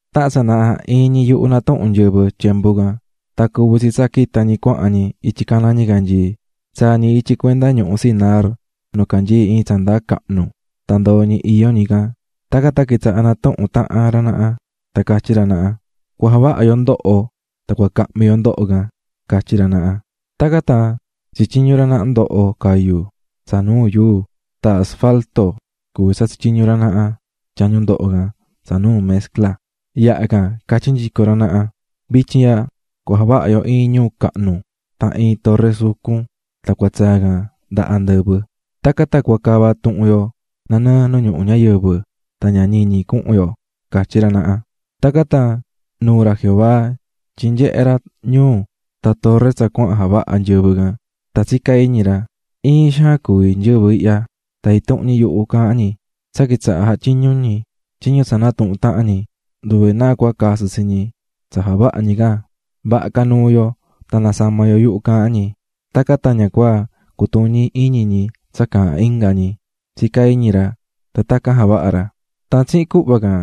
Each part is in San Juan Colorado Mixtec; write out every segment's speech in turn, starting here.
Tahan tsanaha iin ñi yuhu natuhún nyɨvɨ. Tan cuvi̱ tsi tsa quita̱ ñi cuahan ñi ityi caná ñicanyii. Tsaa̱ ñi ityi cuenda ñuhu Sinar nu canyií iin tsa ndaa cahnu tan ndoo̱ ñi iyó ñi can. Tacan tan quitsaha̱ natuhún tahan juhva ra naha tan catyí ra naha: "Cua javaha yo ndoho tan cua cahmi yo ndoho can", catyí ra naha. Tacan javaha̱ ra naha, tsityiñu̱ ra naha ndoho cayu̱ tsa nuu yuu, tan tyañu ndoho can tyihi̱ ra naha tsa cuví tumaa chapopote. Yaha can catyí nyico ra naha: "Vityin ihya cua javaha yo iin ñuu cahnu tan iin torre sucun tan cua tsaa can nda andɨvɨ. Tacan tan cua cava tuhun yo nanɨɨ nu ñuhu ñayɨvɨ tan ña ñiñi cuhun yo", catyí ra naha. Tacan tan nuu̱ ra Jehová tyin nyehé ra ñuu tan torre tsa cuahan javahá nyɨvɨ can. Tan tsicá iñi ra: "Iin xaan cuví nyɨvɨ ihya tan intuhun ñi yuhu caahán ñi, tsa quitsaha̱ jatyiñú ñi tyiñu tsa natuhu̱n tahan ñi, nduve náa cua casɨ tsi ñi tsa javahá ñi can. Vaha ca nuu yo tan nasama yo yuhu caahán ñi, tacan tan ña cua cutuñi iñi ñi tsa caahán inga ñi", tsicá iñi ra. Tan tacan javaha̱ ra. Tan tsihin cuhva can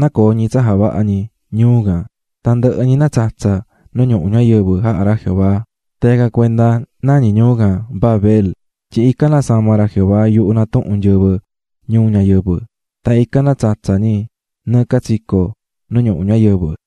nacoo̱ ñi tsa javahá ñi ñuu can, tan ndɨhɨ ñi natsatsa̱ nu ñuhu ñayɨvɨ jaha̱ ra Jehová. Tan yacan cuenda nañí ñuu can Babel, tyin ican nasama̱ ra Jehová yuhu natuhún nyɨvɨ ñuu ñayɨvɨ, tan ican natsatsa̱ ñi nɨɨ catsico nu ñuhu ñayɨvɨ.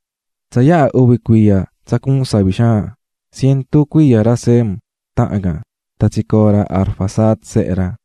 Tsa yaha uvi cuiya tsa cuu̱n savi xaan, cientu cuiya ra Sem tahan can, tan tsicoo̱ ra Arfaxad, sehe ra.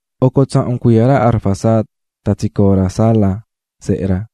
Oco tsahun cuiya ra Arfaxad tan tsicoo̱ ra Sala, sehe ra.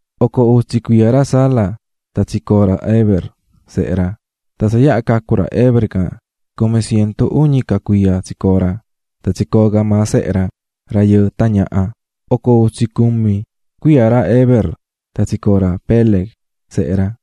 Oco utsi cuiya ra Sala tan tsicoo̱ ra Heber, sehe ra. Tan tsa yaha cacu̱ ra Heber can, cumi cientu uñi ca cuiya tsicoo̱ ra, tan tsicoo̱ ca maa sehe ra, rayɨɨ tan ñaha. Oco utsi cumi cuiya ra Heber tan tsicoo̱ ra Peleg, sehe ra.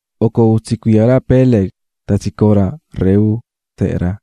Oco utsi cuiya ra Peleg tan tsicoo̱ ra Reu, sehe ra.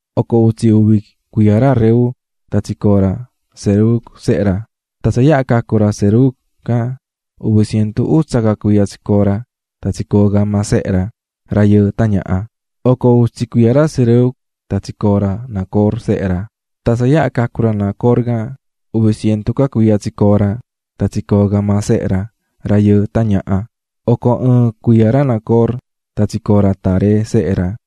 Oco utsi uvi cuiya ra Reu tan tsicoo̱ ra Serug, sehe ra. Tan tsa yaha cacu̱ ra Serug can, uvi cientu utsa ca cuiya tsicoo̱ ra, tan tsicoo̱ ca maa sehe ra, rayɨɨ tan ñaha. Oco utsi cuiya ra Serug tan tsicoo̱ ra Nacor, sehe ra. Tan tsa yaha cacu̱ ra Nacor can, uvi cientu ca cuiya tsicoo̱ ra, tan tsicoo̱ ca maa sehe ra, rayɨɨ tan ñaha. Oco ɨɨn cuiya ra Nacor tan tsicoo̱ ra Taré, sehe ra.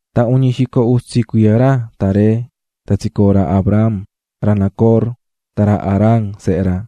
Tan uñi xico utsi cuiya ra Taré tan tsicoo̱ ra Abram, ra Nacor tan ra Harán, sehe ra.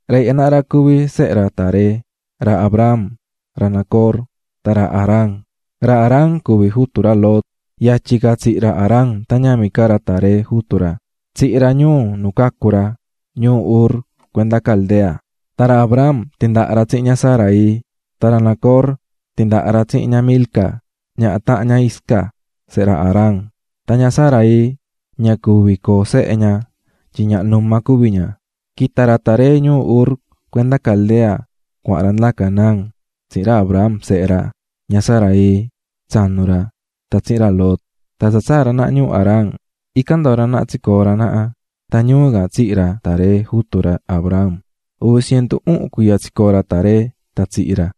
Ra ihya naha ra cuví sehe ra Taré: ra Abram, ra Nacor tan ra Harán. Ra Harán cuví jutu ra Lot. Yatyi ca tsihi̱ ra Harán tan ñavin ca ra Taré, jutu ra. Tsihi̱ ra ñuu nu cacu̱ ra, ñuu Ur cuenda Caldea. Tan ra Abram tindaha̱ ra tsihin ña Sarai. Tan ra Nacor tindaha̱ ra tsihin ña Milca, ñaha tahan ña Isca, sehe ra Harán. Maatyin ña Sarai ña tsicoó sehe ña tyin ñaha numa cuví ña. Quita̱ ra Taré ñuu Ur cuenda Caldea cuahan ra nda Canaán, tsihin ra Abram, sehe ra, ña Sarai, tsanu ra, tan tsihin ra Lot. Tan tsa tsaa̱ ra naha ñuu Harán, ican ndoo̱ ra naha tsicoo̱ ra naha. Tan ñuu can tsihi̱ ra Taré, jutu ra Abram. Uvi cientu uhun cuiya tsicoo̱ ra Taré tan tsihi̱ ra.